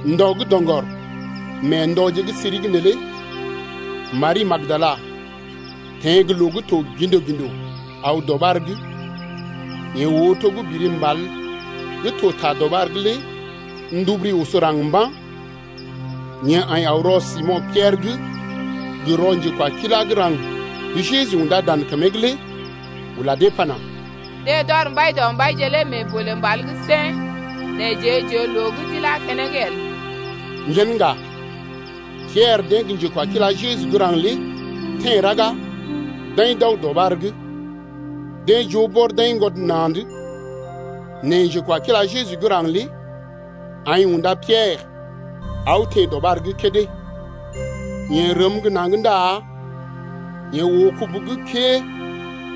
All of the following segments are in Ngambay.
Ndɔ gə́ doŋgɔr mee ndɔje gə́ siri’g neelé Mari gə́ Magdala teḛ gə loo gə́ to gḭdo-gḭdo aw dɔɓar’g, yeḛ oo to gə́ biri mbal gə́ to ta dɔɓar’g lé nduburu oso raŋg mba̰. Yeḛ aḭ aw rɔ Simo̰ Piɛrə’g gə rɔ njekwakila gə́ raŋg gə́ Jeju undá dan kəmee’g lé ula dee pana: Deḛ d’ɔr Mbaidɔmbaije lé mee bolè mbal’g sèn, nɛ jeḛ j’oo loo gə́ d’ilá keneŋ el. Yen ŋga, Piɛrə deḛ gə njekwakila Jeju gə́ raŋg lé teḛ raga d’aḭ d’aw dɔɓar’g. Deḛ joo bɔr d’aiŋgwɔd na̰’d. Nɛ njekwakila Jeju gə́ raŋg lé aḭ unda Piɛrə aw teḛ dɔɓar’g kédé, Yeḛ rəm gə́ naŋg ndá yeḛ oo kubu gə́ kəee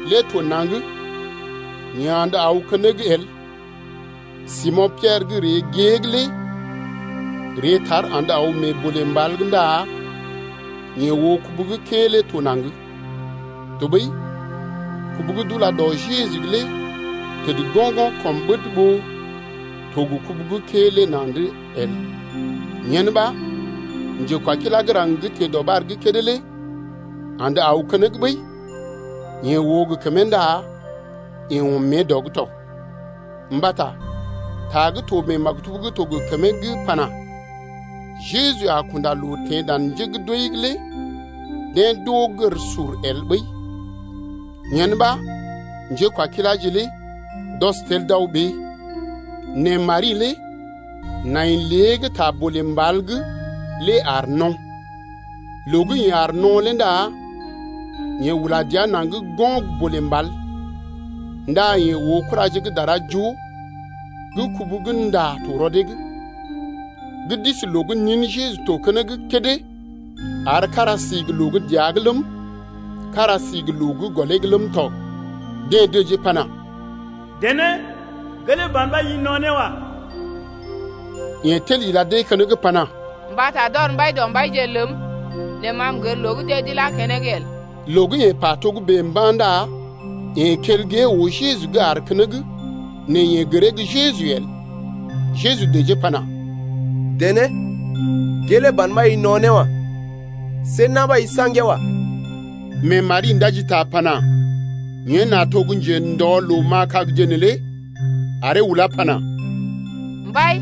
lé to naŋg nɛ yeḛ andə aw keneŋ el. Simo̰ Piɛrə gə́ ree gée’g lé ree tar andə aw mee bolè mbal’g ndá yeḛ oo kubu gə́ kəee lé to naŋg, tɔɓəi kubu gə́ d’ula dɔ Jeju’g lé təd go̰-go̰ kɔm ɓəd ɓó to gə kubu gə́ kəee lé na̰’d lé el. Yen ɓa njekwakila gə́ raŋg gə́ teḛ dɔɓar’g kédé lé andə aw keneŋ ɓəi, yeḛ oo gə kəmee ndá yeḛ ɔm mée dɔ’g tɔ. Mbata ta gə́ to mee maktub gə́ to gə kəmee gə́ pana: Jeju a kunda loo teḛ dan njé gə́ d’wəi’g lé deḛ d’oo gər sur el ɓəi. Yen ɓa njékwakiláje lé d’ɔs tel d’aw ɓee. Nɛ Mari lé nai lée’g ta bolè mbal’g lé aar no̰. Loo gə́ yeḛ aar no̰ lé ndá yeḛ ula dəa naŋg go̰ bolè mbal, ndá yeḛ oo kuraje gə́ dara joo gə́ kubu gə́ nda to rɔ dee’g, gə́ d’isi loo gə́ nin Jeju to keneŋ kédé ar kára si gə́ loo gə́ dəa’g ləm, kára si gə́ loo gə́ gɔlee’g ləm tɔ. Deḛ dəjee pana: Dené, gelee ban ɓa i no̰ ne wa. Yeḛ tel ila dee keneŋ pana: Mbata d’ɔr Mbaidɔmbaije ləm nɛ ma m’gər loo gə́ deḛ d’ilá keneŋ el. Loo gə́ yeḛ pa togə́bè mba̰ ndá yeḛ kel gée oo Jeju gə́ aar keneŋ nɛ yeḛ gəree gə́ Jeju el. Jeju dəjee pana: Dené, gelee ban ɓa i no̰ ne wa. See na̰ ɓa i saŋgee wa. Mee Mari ndaji ta pana: Yen nà to gə́ njendɔ loo ma̰a kagje neelé aree ulá pana: Mbai,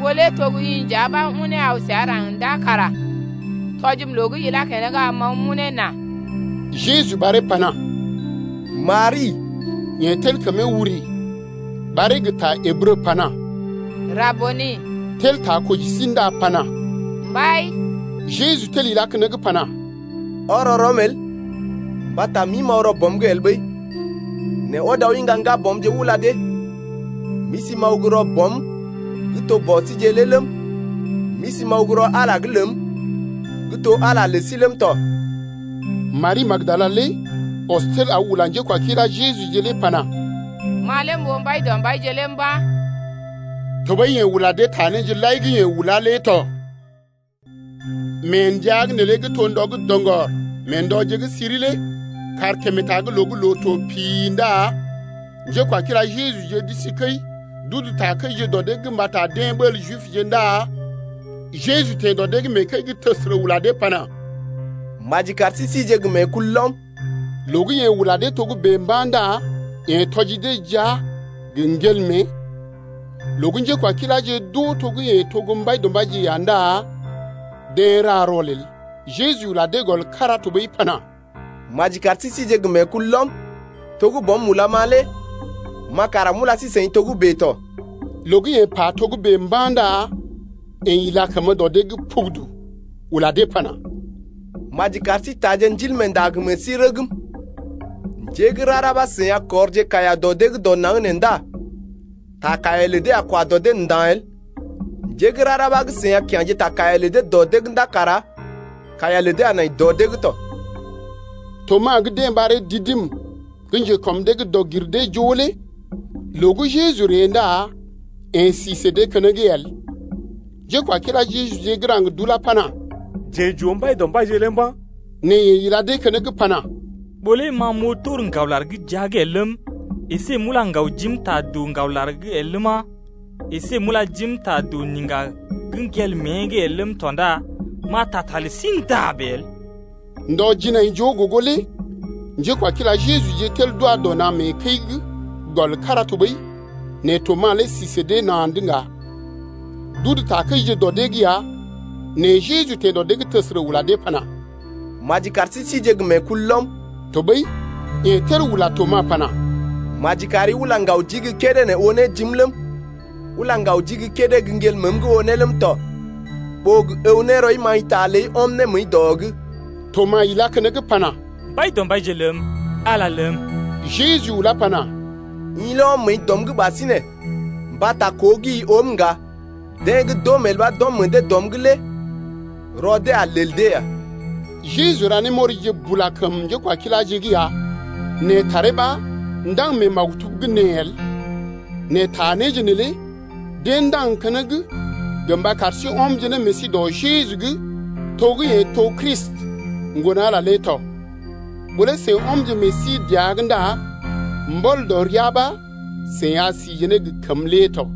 ɓó lé to gə́ i nja ɓa unee aw səa raŋg ndá kara tɔjim loo gə́ ilá keneŋ lé am m’aw m’unee nà. Jeju ɓaree pana: Mari! Yeḛ tel kəmee wuri, ɓaree gə ta Ǝbrə pana: Rabuni, (tel ta koji sí ndá pana: Mbai ləm!) Jeju tel ilá keneŋ pana: Ɔrɔ rɔm el, mbata m’ḭ m’aw rɔ Bɔm’g el ɓəi. Nɛ ɔd aw iŋga ŋgabɔmje ula dee: M’isi m’aw gə́ rɔ Bɔm gə́ to Bɔ síje lé ləm, m’isi m’aw gə́ rɔ Ala’g lé ləm gə́ to Ala lé lə sí ləm tɔ. Mari gə́ Magdala lé ɔs tel aw ula njékwakila Jejuje lé pana: Ma lé m’oo Mbaidɔmbaije lé mba̰. Tɔɓəi yeḛ ula dee ta néje lai gə́ yeḛ ulá lé tɔ. Mee ndəa’g neelé gə́ to ndɔ gə́ doŋgɔr mee ndɔje gə́ siri lé kàrkemetag loo gə́ loo to pi-i ndá njékwakila Jejuje d’isi kəi d’udu takəije dɔ dee’g mbata deḛ ɓəl Jibje ndá Jeju teḛ dɔ dee’g mee kəi’g təsərə ula dee pana: Maji kar sí sije gə meekulɔm. Loo gə́ yeḛ ula dee togə́bè mba̰ ndá yeḛ tɔji dee jia gə ŋgel mée. Loo gə́ njékwakiláje d’oo to gə́ yeḛ to gə́ Mbaidɔmbaije ya ndá deḛ ra rɔlel. Jeju ula dee gɔl kára tɔɓəi pana: Maji kar sí sije gə meekulɔm. To gə́ Bɔm ulam-ma lé ma kara m’ula sí-seḭ togə́bè tɔ. Loo gə́ yeḛ pa togə́bè mba̰ ndá yeḛ ila kəmə dɔ dee’g pugudu ula dee pana: Maji lar sí taaje Ndilmeenda gə meḛ sí rəgm. Njé gə́ rara ɓa gə́ seḭ a kɔrje kaiya dɔ dee’g dɔ naŋg nee ndá ta kaiya lə dee a kwa dɔ dee nda̰ el. Njé gə́ rara ɓa gə́ seḭ a kya̰je ta kaiya lə dee dɔ dee’g ndá kara kaiya lə dee a nai dɔ dee’g tɔ. Tomas gə́ deḛ ɓaree Didim gə́ njekɔm dee’g dɔg-gir-dee-joo lé loo gə́ Jeju ree ndá yeḛ si sə dee keneŋ el. Njékwakila Jejuje gə́ raŋg d’ulá pana: Jeḛ j’oo Mbaidɔmbaije lé mba̰. Nɛ yeḛ ila dee keneŋ pana: Ɓó lé ma m’oo tor ŋgawlar gə́ jia’g el ləm, əsé m’ula ŋgaw jim ta doo ŋgawlar’g el ləma, əsé m’ula jim ta doo niŋga gə́ ŋgel mée’g el ləm tɔ ndá m’a taa ta lə sí nda̰ bèe el. Ndɔ jinaijoo gogo lé njékwakila Jejuje tel d’wa dɔ na̰ mee kəi’g gɔl kára tɔɓəi nɛ Tomas lé si sə dee na̰’d ŋga. D’udu takəije dɔ dee’g ya nɛ Jeju teḛ dɔ dee’g təsərə ula dee pana: Maji kar sí sije gə meekulɔm. Tɔɓəi yeḛ tel ula Tomas pana: Maji kari ula ŋgaw jii gə́ kédé oo ne jim ləm, ula ŋgaw jii gə́ kédé gə́ ŋgel məəm’g oo ne ləm tɔ, ɓó gə əw ne rɔi maḭta ləi ɔm ne məəi dɔ’g. Tomas ilá keneŋ pana: Mbaidɔmbaije ləm! Ala ləm! Jeju ulá pana: I lé ɔm məəi dɔm’g ɓasinè mbata koo gə́ i oom ŋga. Deḛ gə́ d’oom el ɓa d’ɔm meḛ dee dɔm’g lé rɔ dee a lel dee ya. Jeju ra némɔrije bula kəm njékwakiláje’g ya, nɛ taree ɓa ndaŋg mee maktub’g nee el. Nɛ ta néje neelé deḛ ndaŋg keneŋ gə mba kar sí ɔmje ne meḛ sí dɔ Jeju’g to gə́ yeḛ to Kristi, Ŋgon-Ala lé tɔ. Ɓó lé seḭ ɔmje meḛ sí dəa’g ndá mbɔl dɔ ria ɓa seḭ a sije ne gə kəmə lé tɔ.